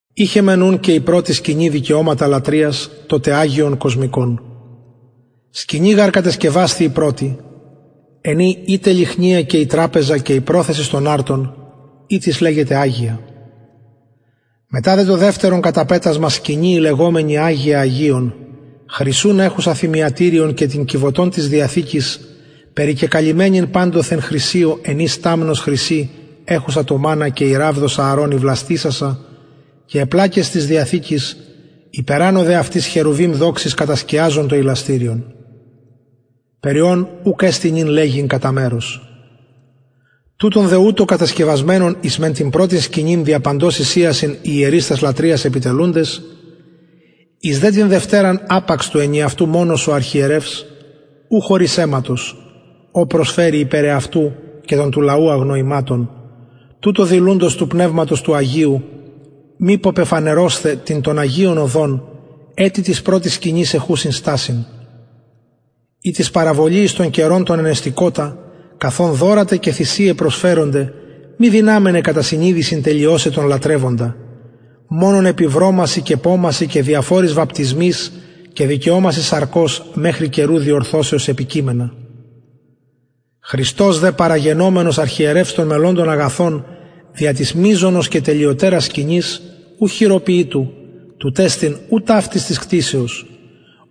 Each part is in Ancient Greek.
ειχεν μεν ουν και η πρωτη δικαιωματα λατρειας το τε αγιον κοσμικον σκηνη γαρ κατεσκευασθη η πρωτη εν η η τε λυχνια και η τραπεζα και η προθεσις των αρτων ητις λεγεται αγια μετα δε το δευτερον καταπετασμα σκηνη η λεγομενη αγια αγιων χρυσουν εχουσα θυμιατηριον και την κιβωτον της διαθηκης περικεκαλυμμενην παντοθεν χρυσιω εν η σταμνος χρυση εχουσα το μαννα και η ραβδος ααρων η βλαστησασα και αι πλακες της διαθηκης υπερανω δε αυτης χερουβιμ δοξης κατασκιαζοντα το ιλαστηριον περι ων ουκ εστιν νυν λεγειν κατα μερος τουτων δε ουτως κατεσκευασμενων εις μεν την πρωτην σκηνην δια παντος εισιασιν οι ιερεις τας λατρειας επιτελουντες εις δε την δευτεραν απαξ του ενιαυτου μονος ο αρχιερευς ου χωρις αιματος ο προσφερει υπερ εαυτου και των του λαου αγνοηματων τουτο δηλουντος του πνευματος του αγιου μηπω πεφανερωσθαι την των αγιων οδον ετι της πρωτης σκηνης εχουσης στασιν ητις παραβολη εις τον καιρον τον ενεστηκοτα καθ ον δωρα τε και θυσιαι προσφερονται μη δυναμεναι κατα συνειδησιν τελειωσαι τον λατρευοντα μονον επι βρωμασιν και πομασιν και διαφοροις βαπτισμοις και δικαιωμασιν σαρκος μεχρι καιρου διορθωσεως επικειμενα χριστος δε παραγενομενος αρχιερευς των μελλοντων αγαθων δια της μειζονος και τελειοτερας σκηνης ου χειροποιητου τουτ εστιν ου ταυτης της κτισεως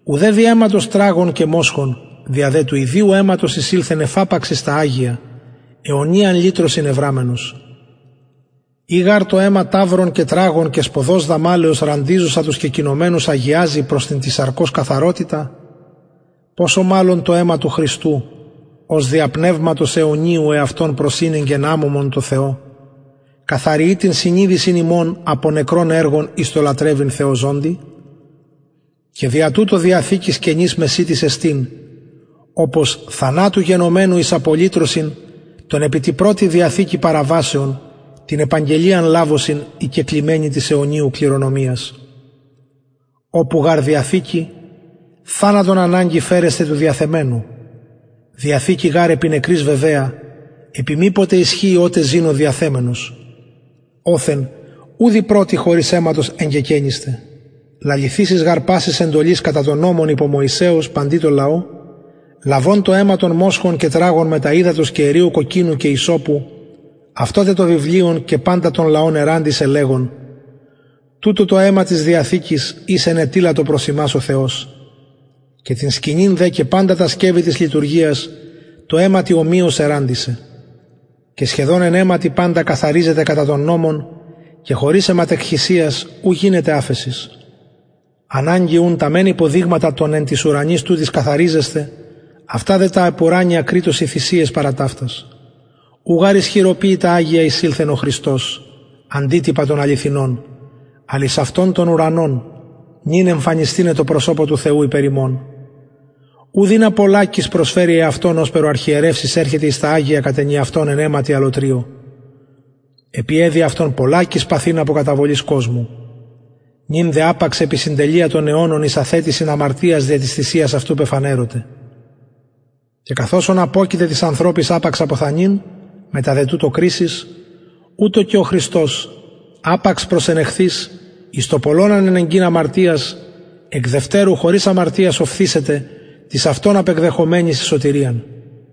ουδε δι αιματος τραγων και μοσχων δια δε του ιδιου αιματος εισηλθεν εφαπαξ εις τα αγια αιωνιαν λυτρωσιν ευραμενος ει γαρ το αιμα ταυρων και τραγων και σποδος δαμαλεως ραντιζουσα τους κεκοινωμενους αγιαζει προς την της σαρκος καθαροτητα ποσω μαλλον το αιμα του χριστου ος δια πνευματος αιωνιου εαυτον προσηνεγκεν αμωμον τω θεω καθαριει την συνειδησιν υμων απο νεκρων εργων εις το λατρευειν θεω ζωντι και δια τουτο διαθηκης καινης μεσιτης εστιν οπως θανατου γενομενου εις απολυτρωσιν των επι τη πρωτη διαθηκη παραβασεων την επαγγελιαν λαβωσιν οι κεκλημενοι της αιωνιου κληρονομιας οπου γαρ διαθηκη θανατον αναγκη φερεσθαι του διαθεμενου διαθηκη γαρ επι νεκροις βεβαια επει μηποτε ισχυει οτε ζη ο διαθεμενος οθεν ουδ η πρωτη χωρις αιματος εγκεκαινισται λαληθεισης γαρ πασης εντολης κατα νομον υπο μωυσεως παντι τω λαω λαβων το αιμα των μοσχων και τραγων μετα υδατος και εριου κοκκινου και υσσωπου αυτο τε το βιβλιον και παντα τον λαον ερραντισεν λεγων τουτο το αιμα της διαθηκης ης ενετειλατο προς υμας ο θεος και την σκηνην δε και παντα τα σκευη της λειτουργιας τω αιματι ομοιως ερραντισεν και σχεδον εν αιματι παντα καθαριζεται κατα τον νομον και χωρις αιματεκχυσιας ου γινεται αφεσις αναγκη ουν τα μεν υποδειγματα των εν τοις ουρανοις τουτοις καθαριζεσθαι αυτα δε τα επουρανια κρειττοσιν θυσιαις παρα ταυτας ου γαρ εις χειροποιητα αγια εισηλθεν ο χριστος αντιτυπα των αληθινων αλλ εις αυτον τον ουρανον νυν εμφανισθηναι τω προσωπω του θεου υπερ ημων ουδ ινα πολλακις προσφερη εαυτον ωσπερ ο αρχιερευς εισερχεται εις τα αγια κατ ενιαυτον εν αιματι αλλοτριω επει εδει αυτον πολλακις παθειν απο καταβολης κοσμου νυν δε απαξ επι συντελεια των αιωνων εις αθετησιν αμαρτιας δια της θυσιας αυτου πεφανερωται και καθ οσον αποκειται τοις ανθρωποις απαξ αποθανειν μετα δε τουτο κρισις ουτως και ο χριστος απαξ προσενεχθεις εις το πολλων ανενεγκειν αμαρτιας εκ δευτερου χωρις αμαρτιας οφθησεται τοις αυτον απεκδεχομενοις εις σωτηριαν